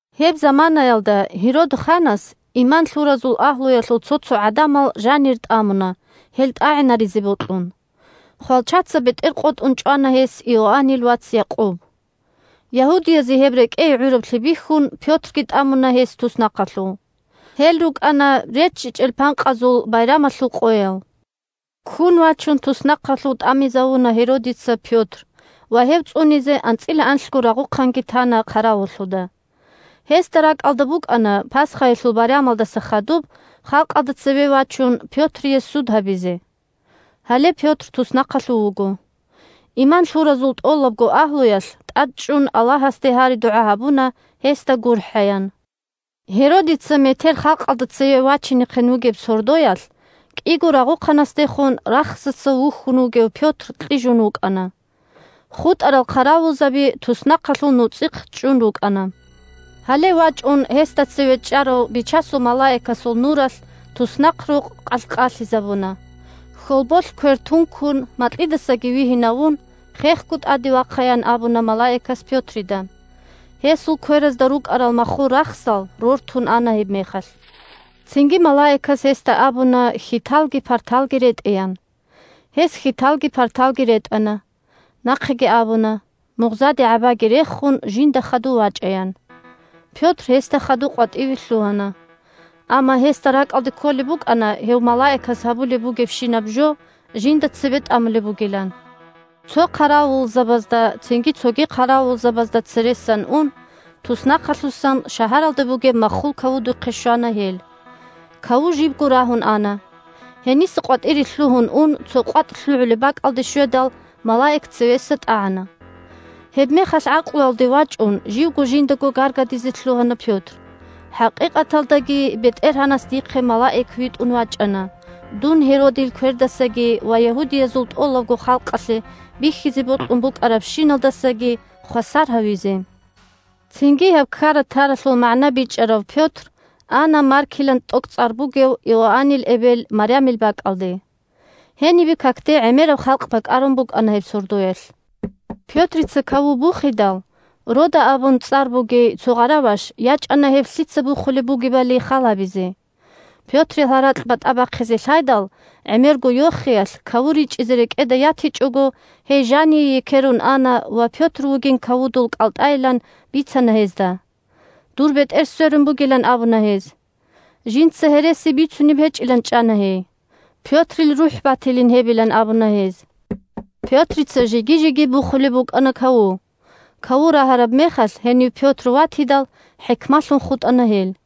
Гьеб заманаялда Гьерод ханас иман лъуразул агьлуялъул цо-цо гӀадамал жанир тӀамуна, гьел тӀагӀинаризе бокьун. Хвалчаца бетӀер къотӀун чӀвана гьес Иоаннил вац Якъуб. Ягьудиязе гьеб рекӀее гӀураблъи бихьун, Пётрги тӀамуна гьес туснахъалъув. (Гьел рукӀана РеччичӀел Панкъазул Байрамалъул къоял.) Ккун вачун туснахъалъув тӀамизавуна Гьеродица Пётр ва гьев цӀунизе анцӀила анлъго рагъухъанги тана хъаравуллъуда. Гьесда ракӀалда букӀана Пасхаялъул байрамалдаса хадуб халкъалда цеве вачун Пётрие суд гьабизе. Гьале Пётр туснахъалъув вуго. Иман лъуразул тӀолабго агьлуялъ тӀадчӀун Аллагьасде гьари-дугӀа гьабуна гьесда гурхӀаян. Гьеродица метер халкъалда цеве вачинехъин вугеб сордоялъ кӀиго рагъухъанасдехун рахсаца вухьун вугев Пётр кьижун вукӀана. ХутӀарал хъаравулзаби туснахъалъул нуцӀихъ чӀун рукӀана. Гьале вачӀун гьесда цеве чӀарав Бичасул малаикасул нуралъ туснахърукъ къалъ-къалъизабуна. Хьолболъ квер тункун макьидасаги вигьинавун: «Хехго тӀаде вахъа!» – ян абуна малаикас Пётрида. Гьесул кверазда рукӀарал маххул рахсал рортун ана гьебмехалъ. Цинги малаикас гьесда абуна хьиталги парталги ретӀеян. Гьес хьиталги парталги ретӀана. Нахъеги абуна, мугъзаде гӀабаги рехун, жинда хадув вачӀаян. Пётр гьесда хадув къватӀиве лъугьана. Амма гьесда ракӀалде кколеб букӀана гьев малаикас гьабулеб бугебщинаб жо жинда цебетӀамулеб бугилан. Цо хъаравулзабазда, цинги цоги хъаравулзабазда цересан ун, туснахъалъусан шагьаралде бугеб маххул кавудухъе щвана гьел. Каву жибго рагьун ана. Гьениса къватӀире лъугьун ун цо къватӀ лъугӀулеб бакӀалде щведал, малаик цевеса тӀагӀана. Гьебмехалъ гӀакълуялде вачӀун живго жиндаго гаргадизе лъугьана Пётр: «ХӀакъикъаталдаги БетӀергьанас дихъе малаик витӀун вачӀана дун Гьеродил квердасаги ва ягьудиязул тӀолабго халкъалъе бихьизе бокьун букӀарабщиналдасаги хвасар гьавизе». Цинги гьеб ккара-таралъул магӀна бичӀчӀарав Пётр ана Маркилан тӀокӀцӀар бугев Иоаннил эбел Марямил бакӀалде. Гьенибе какде гӀемераб халкъ бакӀарун букӀана гьеб сордоялъ. Пётрица каву бухидал, Рода абун цӀар бугей цо гъараваш ячӀана гьеб лъица бухулеб бугебали хал гьабизе. Пётрил гьаракь батӀа бахъизе лъайдал, гӀемерго йохиялъ каву ричӀизе рекӀеда ятичӀого, гьей жание екерун ана ва Пётр вугин кавудул кӀалтӀайилан бицана гьезда. Дур бетӀер сверун бугилан абуна гьез. Жинца гьереси бицунеб гьечӀилан чӀана гьей. Пётрил рухӀ батилин гьебилан абуна гьез. Пётрица жеги-жеги бухулеб букӀана каву. Каву рагьараб мехалъ, гьенив Пётр ватидал, хӀикмалъун хутӀана гьел.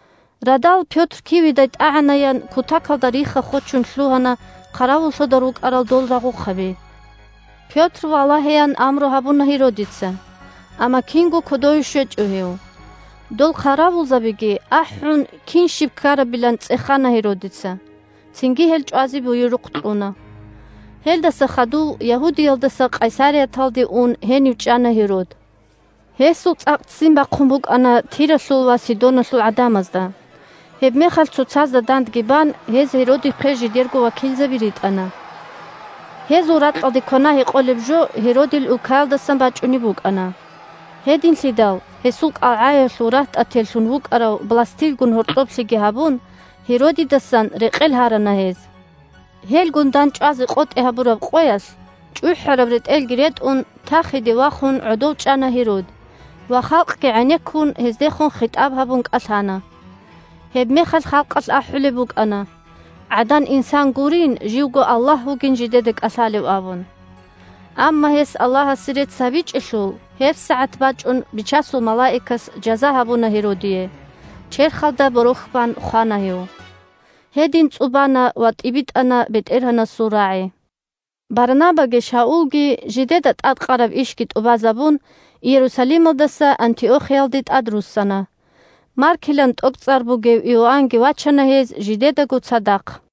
Радал, Пётр киведай тӀагӀанаян, кутакалда рихха-хочун лъугьана хъаравуллъуда рукӀарал дол рагъухъаби. Пётр валагьеян амру гьабуна Гьеродица, амма кинго кодове щвечӀо гьев. Дол хъаравулзабиги ахӀун, кин-щиб ккарабилан цӀехана Гьеродица, цинги гьел чӀвазе буюрухъ кьуна. Гьерод борохьги бан хола Гьелдаса хадув Ягьудиялдаса Къайсарияталде ун, гьенив чӀана Гьерод. Гьесул цӀакъ ццин бахъун букӀана Тиралъул ва Сидоналъул гӀадамазда. Гьебмехалъ цоцазда дандги бан гьез Гьеродихъе жидерго вакилзаби ритӀана. Гьезул ракьалде квана-гьекъолеб жо Гьеродил улкаялдаса бачӀунеб букӀана. Гьединлъидал, гьесул кӀалгӀаялъув рагьтӀателлъун вукӀарав Бластилгун гьоркьоблъиги гьабун, Гьеродидасан рекъел гьарана гьез. Гьелгун дандчӀвазе къотӀи гьабураб къоялъ, чӀухӀараб ретӀелги ретӀун, тахиде вахун гӀодов чӀана Гьерод ва, халкъги гӀенеккун, гьездехун хитӀаб гьабун кӀалъана. Гьебмехалъ халкъалъ ахӀулеб букӀана, гӀадан-инсан гурин, живго аллагь вугин жидеда кӀалъалев абун. Амма гьес Аллагьасе рецц гьабичӀелъул, гьебсагӀат вачӀун Бичасул малаикас жаза гьабуна Гьеродие, черхалда борохь бан хвана гьев. Гьедин цӀубана ва тӀибитӀана БетӀергьанасул рагӀи. Барнабаги Шаулги, жидеда тӀадкъараб ишги тӀубазабун, Иерусалималдаса Антиохиялде тӀадруссана. Маркилан тӀокӀцӀар бугев Иоаннги вачана гьез жидедаго цадахъ.